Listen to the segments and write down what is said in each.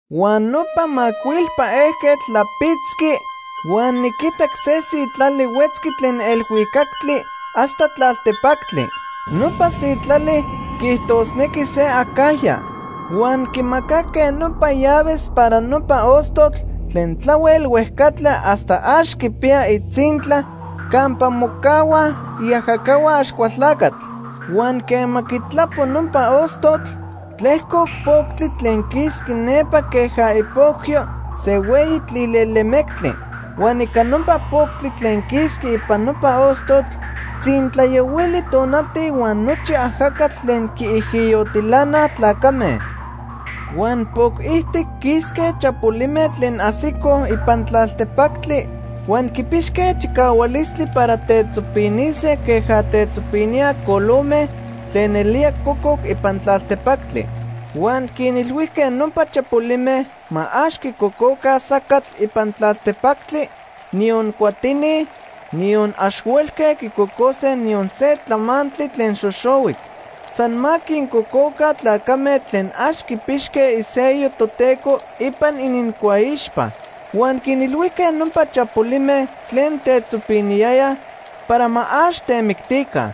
Huan nopa macuilpa ejquetl tlapitzqui huan niquitac se sitlali huetzqui tlen elhuicactli hasta tlaltepactli. Nopa sitlali quiijtosnequi se acajya. Huan quimacaque nopa llaves para nopa ostotl tlen tlahuel huejcatla hasta ax quipiya itzintla campa mocahuaj iajacahua Axcualtlacatl. Huan quema quitlapo nopa ostotl, tlejcoc poctli tlen quisqui nepa queja ipocyo se hueyi tlilelemectli. Huan ica nopa poctli tlen quisqui ipan nopa ostotl tzintlayohuili tonati huan nochi ajacatl tlen quiijiyotilanaj tlacame. Huan poc ijtic quisque chapolime tlen ajsicoj ipan tlaltepactli huan quipixque chicahualistli para tetzopinise queja tetzopiníaj colome tlen nelía cococ ipan tlaltepactli. Huan quinilhuijque nopa chapolime ma ax quicococa sacatl ipan tlaltepactli, niyon cuatini, niyon ax huelque quicocose niyon se tlamantli tlen xoxohuic. San ma quincococa tlacame tlen ax quipixque isello Toteco ipan inincuaixpa. Huan quinilhuijque nopa chapolime tlen tetzopiniyayaj para ma ax temictica.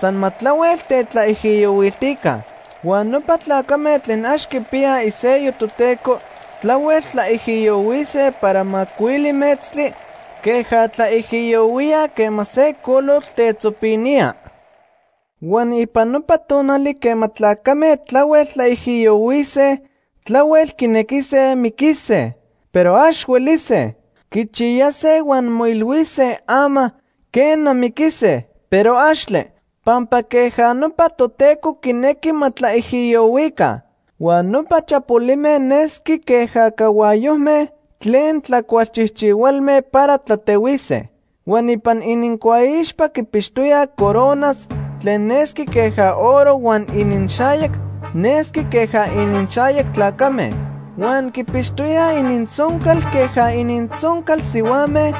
San ma tlahuel tetlaijiyohuiltica. Huan nopa tlacame tlen ax quipiyaj isello Toteco tlahuel tlaijiyohuise para macuili metztli queja tlaijiyohuíaj quema se colotl tetzopinía. Huan ipan nopa tonali quema tlacame tlahuel tlaijiyohuise, tlahuel quinequise miquise, pero ax huelise. Quichiyase huan moilhuise ama, quena, miquise, pero axtle, pampa queja nopa Toteco quinequi ma tlaijiyohuica. Huan nopa chapolime nesqui queja cahuayojme tlen tlacualchijchihualme para tlatehuise. Huan ipan inincuaixpa quipixtoyaj coronas tlen nesqui queja oro huan ininxayac nesqui queja ininxayac tlacame. Huan quipixtoyaj inintzoncal queja inintzoncal sihuame,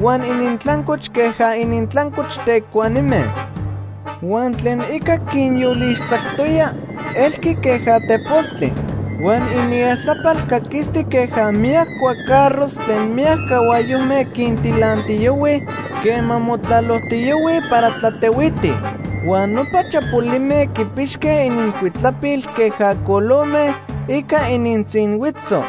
huan inintlancoch queja inintlancoch tecuanime. Huan tlen ica quinyolixtzactoya elqui queja tepostli. Huan inieltlapal caquisti queja miyac cuacarros tlen miyac cahuayojme quintilantiyohuij quema motlalojtiyohuij para tlatehuitij. Huan nopa chapolime quipixque inincuitlapil queja colome ica inintzinhuitzo.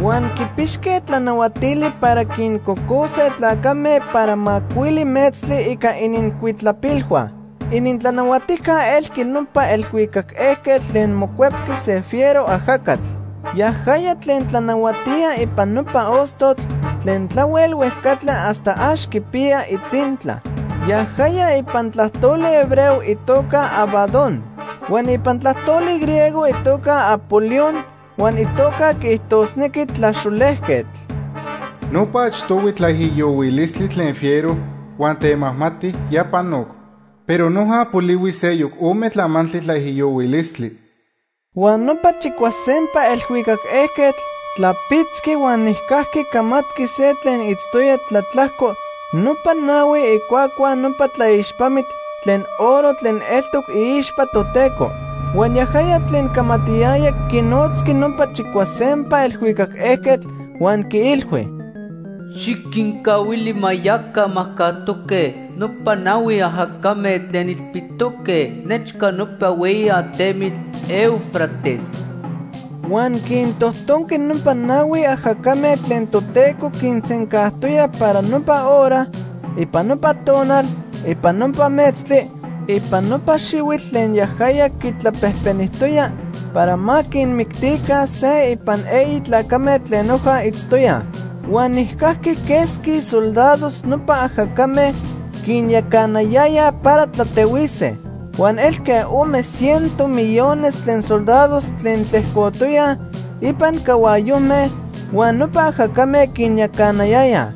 Huan quipixque tlanahuatili para quincocose tlacame para macuili metztli ica inincuitlapilhua. Inintlanahuatijca elqui nopa elhuicac ejquetl tlen mocuepqui se fiero ajacatl. Yajaya tlen tlanahuatía ipan nopa ostotl tlen tlahuel huejcatla hasta ax quipiya itzintla. Yajaya ipan tlajtoli hebreo itoca Abadón. Huan ipan tlajtoli griego itoca Apolión, huan itoca quiijtosnequi Tlaxolejquetl. Nopa achtohui tlaijiyohuilistli tlen fiero huan temajmati ya panoc, pero noja polihui seyoc ome tlamantli tlaijiyohuilistli. Huan nopa chicuasempa elhuicac ejquetl tlapitzqui huan nijcajqui camatqui se tlen itztoya tlatlajco nopa nahui icuacua nopa tlaixpamitl tlen oro tlen eltoc iixpa Toteco. Huan yajaya tlen camatiyaya quinotzqui nopa chicuasempa elhuicac ejquetl huan quiilhui: “Xiquincahuili ma yaca majcajtoque nopa nahui ajacame tlen ilpitoque nechca nopa hueyi atemitl Éufrates.” Huan quintojtonqui nopa nahui ajacame tlen Toteco quinsencajtoya para nopa hora, ipan nopa tonal, ipan nopa metztli, ipan nopa xihuitl tlen yajaya quitlapejpenijtoya para ma quinmictica se ipan eyi tlacame tlen noja itztoyaj. Huan nijcajqui quesqui soldados nopa ajacame quinyacanayayaj para tlatehuise. Huan elque ome ciento millones tlen soldados tlen tlejcotoyaj ipan cahuayojme huan nopa ajacame quinyacanayayaj.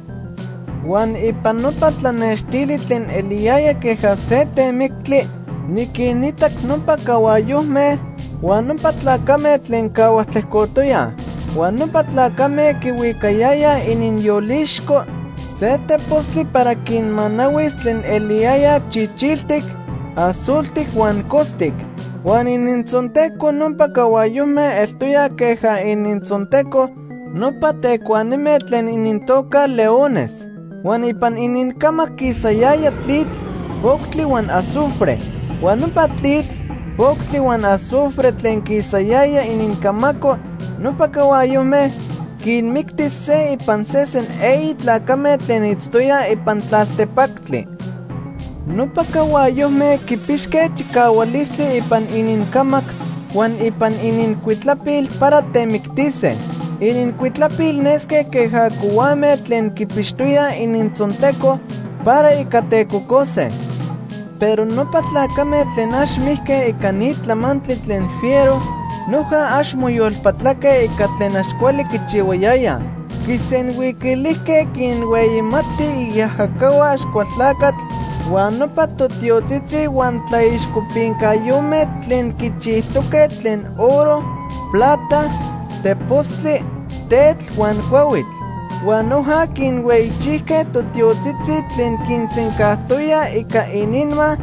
Huan ipan nopa tlanextili tlen eliyaya queja se temictli niquinitac nopa cahuayojme huan nopa tlacame tlen cahuaj tlejcotoyaj. Huan nopa tlacame quihuicayayaj ininyolixco se tepostli para quinmanahuis tlen eliyaya chichiltic, azultic huan costic. Huan inintzonteco nopa cahuayojme eltoya queja inintzonteco nopa tecuanime tlen inintoca leones. Huan ipan inincamac quisayaya tlitl, poctli huan azufre. Huan nopa tlitl, poctli huan azufre tlen quisayaya inincamaco nopa cahuayojme quinmicti se ipan sesen eyi tlacame tlen itztoyaj ipan tlaltepactli. Nopa cahuayojme quipixque chicahualistli ipan inincamac huan ipan inincuitlapil para temictise. Inincuitlapil nesque queja cohuame tlen quipixtoyaj inintzonteco para ica tecocose. Pero nopa tlacame tlen ax mijque ica ni tlamantli tlen fiero noja ax moyolpatlaque ica tlen ax cuali quichihuayayaj. Quisenhuiquilijque quinhueyimatij iajacahua Axcualtlacatl huan nopa totiotzitzi huan tlaixcopincayome tlen quichijtoque tlen oro, plata, tepostli, tetl huan cuahuitl. Huan noja quinhueyichijque totiotzitzi tlen quinsencajtoyaj ica ininma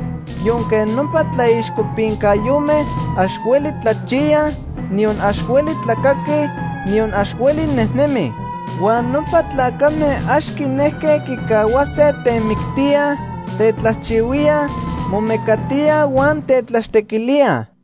yonque nopa tlaixcopincayome ax hueli tlachiyaj, niyon ax hueli tlacaquij, niyon ax hueli nejnemij. Huan nopa tlacame ax quinejque quicahuase temictíaj, tetlajchihuíaj, momecatíaj huan tetlaxtequilíaj.